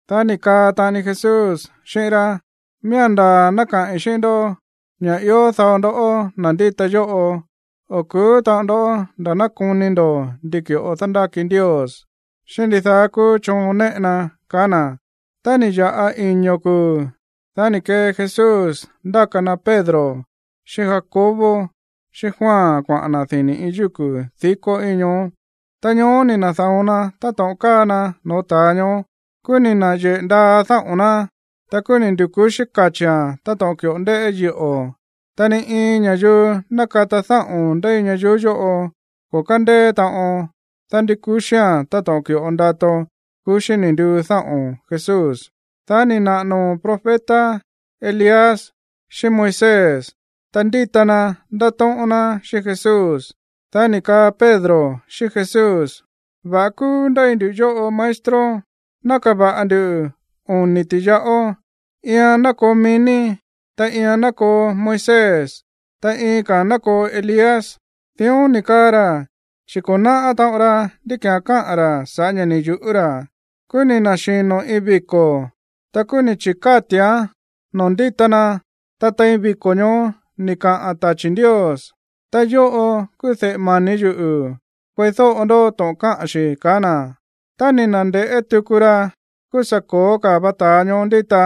Dá ni̱ kaa taꞌani Jesús xíꞌín rá: ―Miía̱n ndaa̱ ná kaꞌi̱n xíꞌín ndó ña̱ ió dao ndoꞌó, na̱ ndíta yóꞌo, o̱ ku̱ú taꞌon ndó nda̱ ná koni ndo̱ ndi ki̱ꞌo dándáki Ndios xíꞌín ndidaá kúú choon néꞌe ná ―kaá na̱. Tá ni̱ ya̱ꞌa iño̱ kuu̱, dá ni̱ kee Jesús ndáka na Pedro, xíꞌín Jacobo, xíꞌín Juan kuaꞌa̱n na̱ dini̱ iin yúku̱ dikó íin ñoó. Ta ñoó ni̱ na̱da̱on na táto̱ꞌon káa na no̱ó ta̱a ñoó. Kúú ni̱ na̱yeꞌe̱ ndaa dáꞌo̱n ná. Ta kúú ni̱ ndu̱ku̱xí kachi̱án táto̱ꞌon ki̱ꞌo ndéꞌé yiꞌo̱. Ta ni iin ña̱yuu nákata dáꞌo̱n ndéi ñayuú yóꞌo ko̱ kándeé taꞌon dándúkuxía̱n táto̱ꞌon ki̱ꞌo ndato kuxí ni̱ nduu dáꞌo̱n Jesús. Dá ni̱ naꞌa̱ noo̱ profeta Elías xíꞌín Moisés, ta ndíta na ndátóꞌón ná xíꞌín Jesús. Dá ni̱ kaa Pedro xíꞌín Jesús: ―Va̱ꞌa kúú ndéi nduꞌu̱ yóꞌo, maestro. Ná kava̱ꞌa ndu oni̱ ti̱yaꞌó. Iian ná koo mií ní, ta iian ná koo Moisés, ta iin ka̱a̱n ná koo Elías. Dión ni̱ kaa ra̱, chi̱ ko̱ náꞌá taꞌon ra ndí ki̱án káꞌa̱n ra̱ sa̱ꞌá ña̱ ni̱ yu̱ꞌú ra̱. Kúú ni̱ na̱xino̱ iin viko̱. Ta kúú ni̱ chi̱káti̱án noo̱ ndíta na. Ta tein viko̱ ñoó ni̱ kaꞌa̱n tachi̱ Ndios: ―Ta yóꞌo kúú de̱ꞌe mani̱ yuꞌu̱. Kueídóꞌo ndó to̱ꞌon káꞌa̱n xi̱ ―kaá na̱. Tá ni̱ na̱nde̱ꞌé tuku ra, kúú sa̱ ko̱ó ka̱ va ta̱a ñoó ndíta.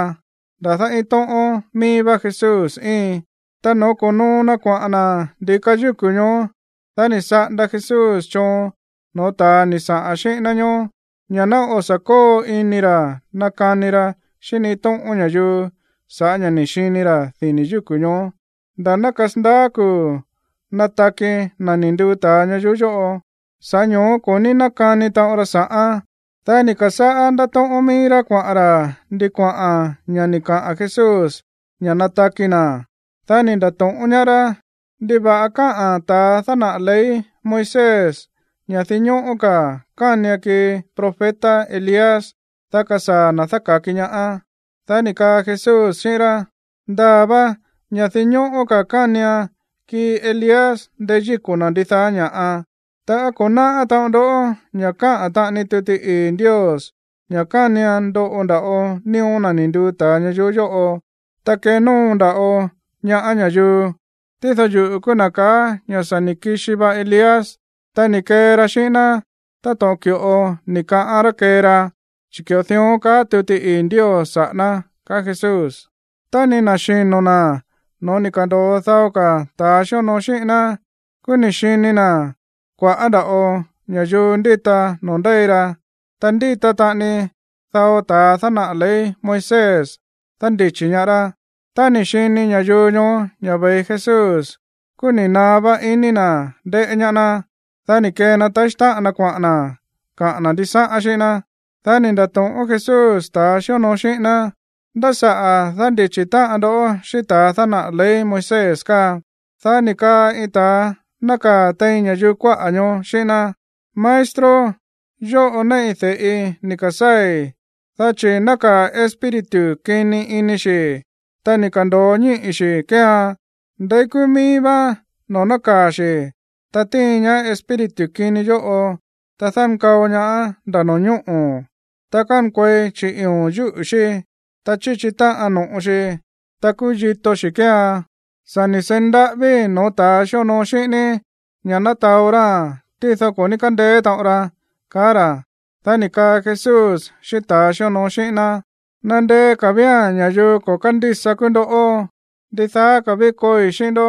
Nda̱dá iin tóꞌón míí vá Jesús íin. Ta noo̱ ko̱noo na kuaꞌa̱n na̱ ndi̱ka yúku̱ ñoó, dá ni̱ saꞌanda Jesús choon no̱ó ta̱a ni̱ saꞌa̱n xíꞌín ná ñoó ña̱ ná o̱ sa̱ kóo ini ra̱ nakani ra xíꞌín ni iin tóꞌón ña̱yuu sa̱ꞌá ña̱ ni̱ xini ra̱ dini̱ yúku̱ ñoó nda̱ ná kasandaá kuu̱ nataki na̱ ni̱ nduu ta̱a ñayuú yóꞌo. Sa̱ꞌá ño̱ó ko̱ ní nákani taꞌon ra sa̱ꞌán. Dá ni̱ ka̱sáꞌá ndátóꞌón míí rá kuaꞌa̱n ra̱ ndi kuaꞌa̱n ña̱ ni̱ kaꞌa̱n Jesús ña̱ nataki na̱. Dá ni̱ nda̱to̱ꞌón ñaá rá: ―¿Ndiva̱ꞌa káꞌa̱n ta̱a dánaꞌa̱ ley Moisés ña̱ dinñóꞌó ka̱ kánian kii profeta Elías, dá kasaa̱ na̱ dáka̱ki ñaá? Dá ni̱ kaa Jesús xíꞌín rá: ―Ndaa̱ va ña̱ dinñóꞌó ka̱ kánian kii Elías ndeyíko̱ na̱ ndidaá ña̱ꞌa. Ta, ¿á ko̱ náꞌá taꞌon ndó ña̱ káꞌa̱n taꞌani tuti ii̱ Ndios ña̱ kánian ndoꞌo nda̱ꞌo nío̱ na̱ ni̱ nduu ta̱a ñayuú yóꞌo, ta kenóo nda̱ꞌo ñaá ña̱yuu? Tído yuꞌu̱ kúú na̱ ka̱á ña̱ sa̱ ni̱ kixi va Elías, ta ni̱ kee ra xíꞌín ná táto̱ꞌon ki̱ꞌo ni̱ kaꞌán rá kee ra, chi̱ ki̱ꞌo dión káꞌa̱n tuti ii̱ Ndios saꞌa̱ ná ―ka̱á Jesús. Tá ni̱ na̱xino̱ na̱ no̱ó ni̱ ka̱ndo̱o dao ka̱ ta̱a xíonoo xíꞌín ná, kúú ni̱ xini na̱ kua̱ꞌá nda̱ꞌo ña̱yuu ndíta noo̱ ndéi ra. Ta ndíta taꞌani dao ta̱a dánaꞌa̱ ley Moisés dándichi̱ ñaá rá. Tá ni̱ xini ña̱yuu ñoó ña̱ ve̱i Jesús, kúú ni̱ naá vá iní na̱ ndéꞌé ñaá ná. Dá ni̱ kee na taxí táꞌan na kuaꞌa̱n na̱ kaꞌa̱n na̱ ndisáꞌán xíꞌín ná. Dá ni̱ nda̱to̱ꞌón Jesús ta̱a xíonoo xíꞌín ná: ―¿Ndá saꞌa̱ dándichi̱ táꞌan ndó xíꞌín ta̱a dánaꞌa̱ ley Moisés káa? Dá ni̱ kaa iin ta̱a nákaa̱ tein ña̱yuu kuáꞌa̱ ñoó xíꞌín ná: ―Maestro, yóꞌo néꞌi de̱ꞌi ni̱ ka̱sáa̱i̱, dá chi̱ nákaa̱ espíritu kini ini xi̱, ta ni̱ ka̱ndo̱o ñíꞌi̱ xi̱ kéean. Ndeí kúú míí vá noo̱ nákaa̱ xi̱, ta tíin ñaá espíritu kini yóꞌo, ta dánkao ñaáán nda̱ no̱ñóꞌo̱, ta kánkuei chiꞌi̱o̱n yúꞌu̱ xí, ta chíchi táꞌan no̱ꞌo xi, ta kúyito xi̱ kéean. Sa̱ ni̱ seí ndaꞌávíi̱ no̱ó ta̱a xíonoo xíꞌín ní ña̱ ná taó ráa̱n, tído ko̱ ní kándeé taꞌon ra ―kaá ra̱. Dá ni̱ kaa Jesús xíꞌín ta̱a xíonoo xíꞌín ná: ―¡Nandeé ka̱ vía̱n ña̱yuu ko̱ kándísa kúú ndoꞌó! ¿Ndidaá ka̱ ví kooi xíꞌín ndó,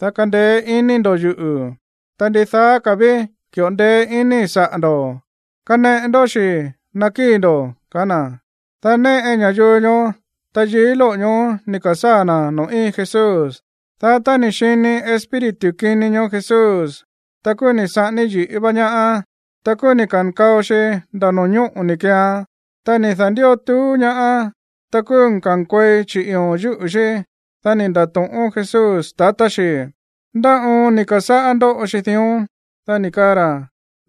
dá kandeé ini ndo̱ yuꞌu̱? Ta, ¿ndidaá ka̱ ví ki̱ꞌo ndeé inii̱ saꞌa̱ ndo̱? Kaneꞌe ndó xi̱ ná kii ndó ―kaá na̱. Dá néꞌe ña̱yuu ñoó tayií lóꞌo̱ ñoó ni̱ ka̱sáa̱ na̱ noo̱ íin Jesús. Dá tá ni̱ xini espíritu kini ñoó Jesús, ta kúú ni̱ saꞌání yi̱ꞌí va ñaáán, ta kúú ni̱ ka̱nkao xi nda̱ no̱ñóꞌo̱ ni̱ keean, ta ni̱ da̱ndió tuú ñaáán. Ta kúú kánkuei chiꞌi̱o̱n yúꞌu̱ xí. Dá ni̱ nda̱to̱ꞌón Jesús tatá xi: ―¿Ndá oon ni̱ ka̱sáꞌá ndóꞌo xi dión? Dá ni̱ kaa ra̱: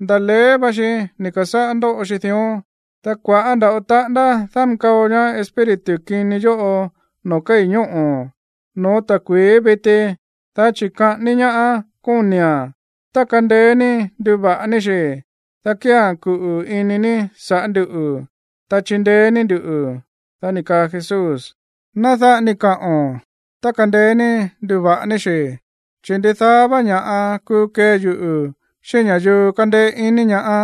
―Nda̱á leé va xi ni̱ ka̱sáꞌá ndóꞌo xi dión. Ta kua̱ꞌá nda̱ꞌo taꞌándá dánkao ñaá espíritu kini yóꞌo noo̱ kéi̱ ñóꞌo̱, no̱ó ta̱kui̱í viti, dá chi̱ kaꞌání ñaáán kóni̱a̱n. Tá kandeé ní nduva̱ꞌa ní xi̱, dá kía̱n kuꞌu̱ ini ní sa̱ꞌá nduꞌu̱, ta chindeé ní nduꞌu̱. Dá ni̱ kaa Jesús: ―Ná dáꞌa ni kaꞌo̱n, “tá kandeé ní nduva̱ꞌa ní xi̱”, chi̱ ndidaá vá ña̱ꞌa kuu kee yuꞌu̱ xíꞌín ña̱yuu kándéé iní ñaá.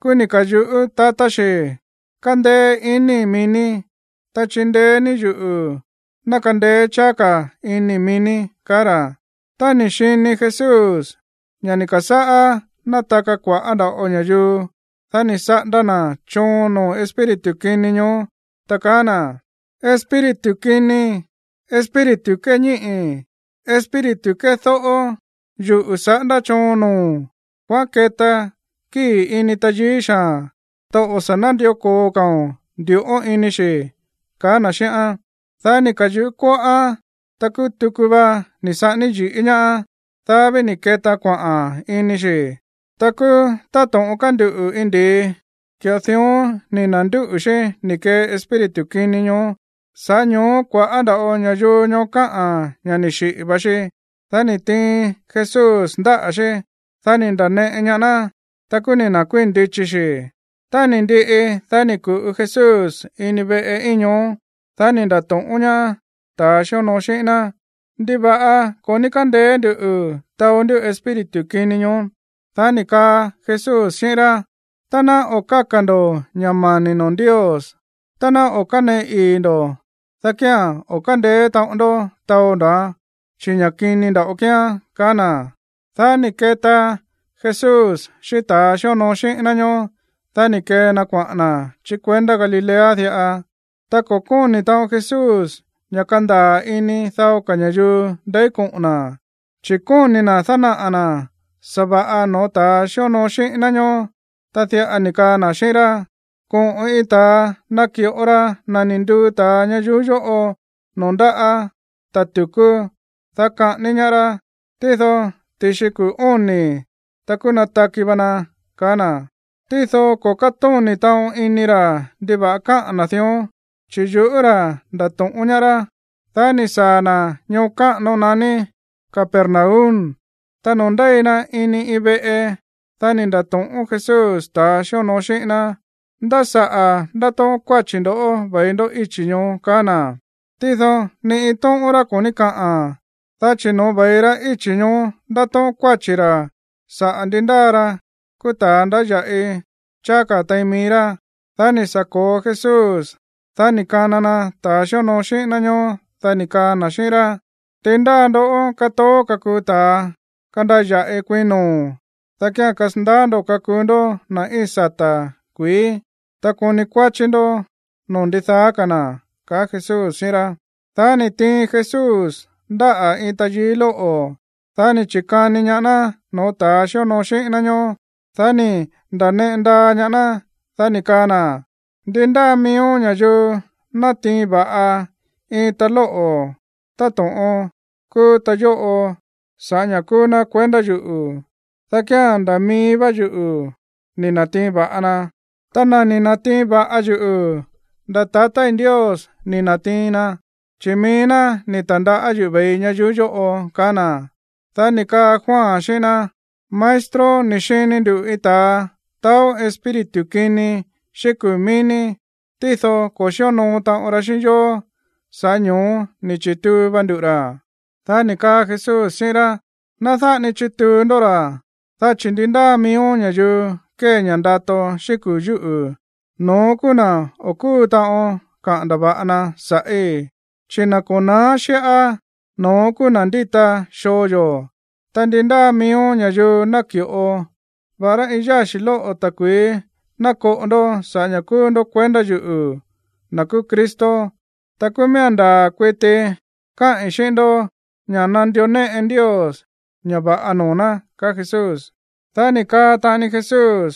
Kúú ni̱ ka̱yuꞌú tatá xi: ―Kándéé iníi̱ mií ní. Ta chindeé ní yuꞌu̱ ná kandeé cháá ka̱ iníi̱ mií ní ―kaá ra̱. Tá ni̱ xini Jesús ña̱ ni̱ ka̱sáꞌá nátaka kua̱ꞌá nda̱ꞌo ña̱yuu, dá ni̱ saꞌanda na̱ choon noo̱ espíritu kini ñoó, ta kaá na̱: ―¡Espíritu kini, espíritu kéñíꞌi̱, espíritu kédóꞌó! ¡Yuꞌu̱ saꞌándá choon noo̱o̱n! ¡Kuaꞌán keta kíi̱ ini tayií xaa̱n! ¡Ta o̱ sa̱ nándió ko̱o ka̱o̱n ndu̱ꞌón ini xi̱! ―kaá na̱ xíꞌán. Dá ni̱ ka̱yuꞌú kóꞌóán. Ta kúú tuku va ni̱ saꞌání yi̱ꞌí ñaáán. Dá ví ni̱ ketaan kuaꞌa̱n ini xi̱. Ta kúú táto̱ꞌon kánduꞌu̱ iin ndi̱i, ki̱ꞌo dión ni̱ na̱ndúꞌu̱ xí ni̱ kee espíritu kini ñoó. Sa̱ꞌá ño̱ó kua̱ꞌá nda̱ꞌo ña̱yuu ñoó káꞌa̱n ña̱ ni̱ xiꞌi̱ va xi. Dá ni̱ tiin Jesús ndáꞌa̱ xí. Dá ni̱ nda̱neꞌe ñaá ná. Ta kúú ni̱ na̱kuíi̱n ndichi xi. Tá ni̱ ndiꞌi, dá ni̱ ku̱ꞌu Jesús ini iin veꞌe íin ñoó. Dá ni̱ nda̱to̱ꞌón ñaá ta̱a xíonoo xíꞌín ná: ―¿Ndiva̱ꞌa ko̱ ní kándeé nduꞌu̱ taó ndú espíritu kini ñoó? Dá ni̱ kaa Jesús xíꞌín rá: ―Tá ná o̱ káka̱ ndo̱ ña̱ mani̱ noo̱ Ndios, ta ná o̱ káneꞌe ii̱ ndo̱, dá kía̱n o̱ kándeé taꞌon ndó taó ndóa̱n, chi̱ ña̱ kini nda̱ꞌo kíán ―kaá na̱. Dá ni̱ keta Jesús xíꞌín ta̱a xíonoo xíꞌín ná ñoó, dá ni̱ kee na kuaꞌa̱n na̱ chí kuendá Galilea diꞌa. Ta ko̱ kóni̱ taꞌon Jesús ña̱ kandaa̱ ini dao ka̱ ña̱yuu ndeí koꞌo̱n na̱, chi̱ kóni̱ na̱ dánaꞌa̱ na̱ sa̱va̱ꞌa no̱ó ta̱a xíonoo xíꞌín ná ñoó, ta diꞌa ni̱ kaa na̱ xíꞌín rá: ―Koꞌo̱n iin ta̱a naki̱ꞌo ra na̱ ni̱ nduu ta̱a ñayuú yóꞌo noo̱ ndáꞌa̱ ta̱ tu̱kú, dá kaꞌání ñaá rá. Tído ti̱xi kuu̱ óni̱, ta kúú nataki va na ―kaá na̱. Tído ko̱ kátóni̱ taꞌon ini ra̱ ndiva̱ꞌa káꞌa̱n na̱ dión, chi̱ yuꞌú ra̱ ndato̱ꞌón ñaá rá. Dá ni̱ saa̱ na̱ ñoo káꞌano naní Capernaum. Ta noo̱ ndéi na ini iin veꞌe, dá ni̱ nda̱to̱ꞌón Jesús ta̱a xíonoo xíꞌín ná: ―¿Ndá saꞌa̱ ndátóꞌón kuáchi̱ ndo̱ ve̱i ndó íchi̱ ñoó? ―kaá na̱. Tído ni iin tóꞌón rá ko̱ ní kaꞌa̱n, dá chi̱ no̱ó ve̱i ra íchi̱ ñoó ndátóꞌón kuáchi̱ ra̱ saꞌa̱ ndi ndáa ra kúú ta̱a ndáya̱ꞌi cháá ka̱ tein mií rá. Dá ni̱ sa̱ ko̱o Jesús. Dá ni̱ kana na ta̱ xíonoo xíꞌín ná ñóó. Dá ni̱ kaa na̱ xíꞌín rá: ―Ndi ndáa ndoꞌó kátoó kakuu ta̱a kandaya̱ꞌi kuiin noo̱, dá kía̱n kasandaá ndo̱ kakuu ndó na̱ íin sata̱ kuií, ta koni kuáchí ndó noo̱ ndidaá ka̱ na̱ ―ka̱á na̱. Dá ni̱ tiin Jesús ndáꞌa̱ iin tayií lóꞌo̱. Dá ni̱ chi̱kani ñaá ná no̱ó ta̱a xíonoo xíꞌín ná ñóó. Dá ni̱ nda̱neꞌe ndaa ñaá ná. Dá ni̱ kaa na̱: ―Ndi ndáa miíó ña̱yuu natiin va̱ꞌa iin ta lóꞌo̱ táto̱ꞌon kúú ta yóꞌo sa̱ꞌá ña̱ kúú ná kuendá yuꞌu̱, dá kía̱n nda̱ mií vá yuꞌu̱ ni̱ na̱tiin va̱ꞌa na. Ta na̱ ni̱ na̱tiin va̱ꞌa yuꞌu̱, nda̱ tatá Ndios ni̱ na̱tiin na, chi̱ mií ná ni̱ ta̱ndaꞌá yuꞌu̱ ve̱ii ñayuú yóꞌo ―kaá na̱. Dá ni̱ kaa Juan xíꞌín ná: ―Maestro, ni̱ xini nduꞌu̱ iin ta̱a taó espíritu kini xíꞌín kuu̱ mií ní. Tído ko̱ xíonoo taꞌon ra xíꞌín yó, sa̱ꞌá ño̱ó ni̱ chi̱tuu va nduꞌu̱ ra̱. Dá ni̱ kaa Jesús xíꞌín rá: ―Ná dáꞌa ni chituu ndó ra̱, dá chi̱ ndi ndáa miíó ña̱yuu kée ña̱ ndato xíꞌín kuu̱ yúꞌu̱, no̱ón kúú na̱ o̱ kúu taꞌon kaꞌa̱n ndava̱ꞌa na sa̱ꞌí. Chi̱ na̱ ko̱ na̱á xíꞌá, no̱ón kúú na̱ ndíta xoo yó. Ta ndi ndáa miíó ña̱yuu naki̱ꞌo, va̱ꞌará iin yáxi̱ lóꞌo̱ ta̱kui̱í ná koꞌo ndó saꞌa̱ ña̱ kúú ndó kuendá yuꞌu̱, na̱ kúú Cristo, ta kúú miía̱n ndaa̱ kuiti káꞌi̱n xíꞌín ndó ña̱ nandió néꞌe Ndios ña̱ va̱ꞌa noo̱ ná ―kaá Jesús. Dá ni̱ kaa taꞌani Jesús: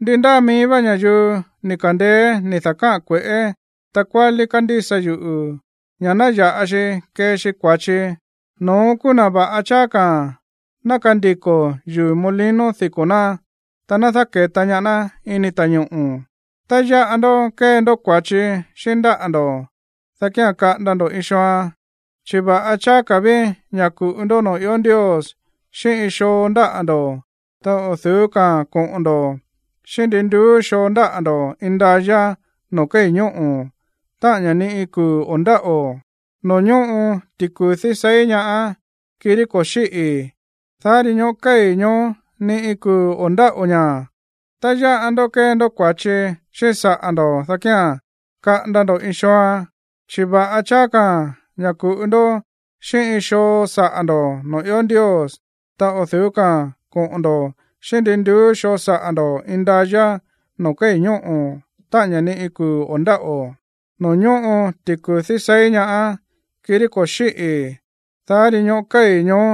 ―Ndi ndáa mií vá ña̱yuu ni̱ ka̱ndeé ni̱ da̱káꞌa̱n kue̱ꞌé takuálí kándísa yuꞌu̱ ña̱ ná ya̱ꞌa xi kee xi kua̱chi, no̱ón kúú na̱ va̱ꞌa cháá ka̱ ná kandiko̱ yuu̱ molino diko̱ ná, ta ná dáke̱ta ñaá ná ini ta̱ñoꞌo̱. Tá yáꞌa ndó kée ndó kua̱chi xíꞌín ndáꞌa̱ ndo̱, dá kía̱n kaꞌanda ndo̱ iin xooan. Chi̱ va̱ꞌa cháá ka̱ ví ña̱ ku̱ꞌu ndó noo̱ ió Ndios xíꞌín iin xoo ndáꞌa̱ ndo̱, ta o̱ du̱ú ka̱a̱n koꞌo̱n ndo̱ xíꞌín ndin nduú xoo ndáꞌa̱ ndo̱ indayá noo̱ kéi̱ ñóꞌo̱, táꞌa̱n ña̱ ni iin kuu̱ o̱ ndáꞌo̱, noo̱ ñóꞌo ti̱ku̱dí seí ñaá, kirí ko̱ xíꞌi̱, dá ri ñóꞌo̱ kei̱ ñoó, ni iin kuu̱ o̱ ndáꞌo̱ ña̱. Tá yáꞌa ndó kée ndó kua̱chi xíꞌín saꞌa̱ ndo̱, dá kía̱n kaꞌanda ndo̱ iin xooan. Chi̱ va̱ꞌa cháá ka̱ ña̱ ku̱ꞌu ndó xíꞌín iin xoo saꞌa̱ ndo̱ noo̱ ió Ndios, ta o̱ du̱ú ka̱a̱n koꞌo̱n ndo̱ xíꞌín ndin nduú xoo saꞌa̱ ndo̱ indayá noo̱ kéi̱ ñóꞌo̱, táꞌa̱n ña̱ ni iin kuu̱ o̱ ndáꞌo̱, noo̱ ñóꞌo ti̱ku̱dí seí ñaá, kirí ko̱ xíꞌi̱, dá ri ñóꞌo̱ kéi̱ ñoó,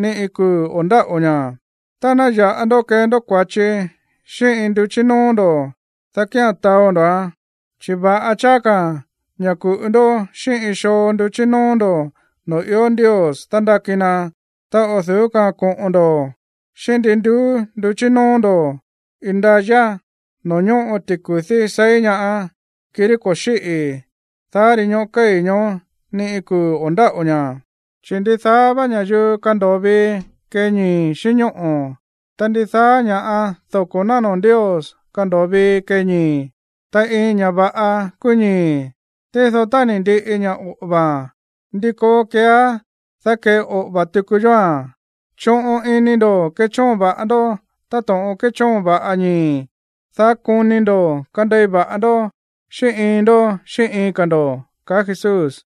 ni iin kuu̱ o̱ ndáꞌo̱ ña̱. Ta tá yáꞌa ndó kée ndó kua̱chi xíꞌín iin nduchí nóó ndo̱, dá kía̱n taó ndóa̱n. Chi̱ va̱ꞌa cháá ka̱ ña̱ ku̱ꞌu ndó xíꞌín iin xoo nduchí nóó ndo̱ noo̱ ió Ndios dándáki na, ta o̱ du̱ú ka̱a̱n koꞌo̱n ndo̱ xíꞌín ndin nduú nduchí nóó ndo̱ indayá, noo̱ ñóꞌo ti̱ku̱dí seí ñaá, kirí ko̱ xíꞌi̱, dá ri ñóꞌo̱ kéi̱ ñoó, ni iin kuu̱ o̱ ndáꞌo̱ ña̱. ’Chi̱ ndidaá vá ña̱yuu kando̱o vii kee ñii̱ xíꞌín ñóꞌo̱, ta ndidaá ña̱ꞌa dóko̱ ná noo̱ Ndios kando̱o vii kee ñii̱. Ta iin ña̱ va̱ꞌa kúú ñii̱, tído tá ni̱ ndiꞌi ña̱ oꞌo̱va̱a̱n, ¿ndi koo keeá, dá keꞌoꞌo̱va̱ tuku yóa̱n? Choꞌon ini ndo̱ kechóon va̱ꞌa ndó táto̱ꞌon kéchóon va̱ꞌa ñii̱, dá koni ndo̱ kandei va̱ꞌa ndó xíꞌín iin ndó xíꞌín iin ka̱ ndo̱ ―kaá Jesús.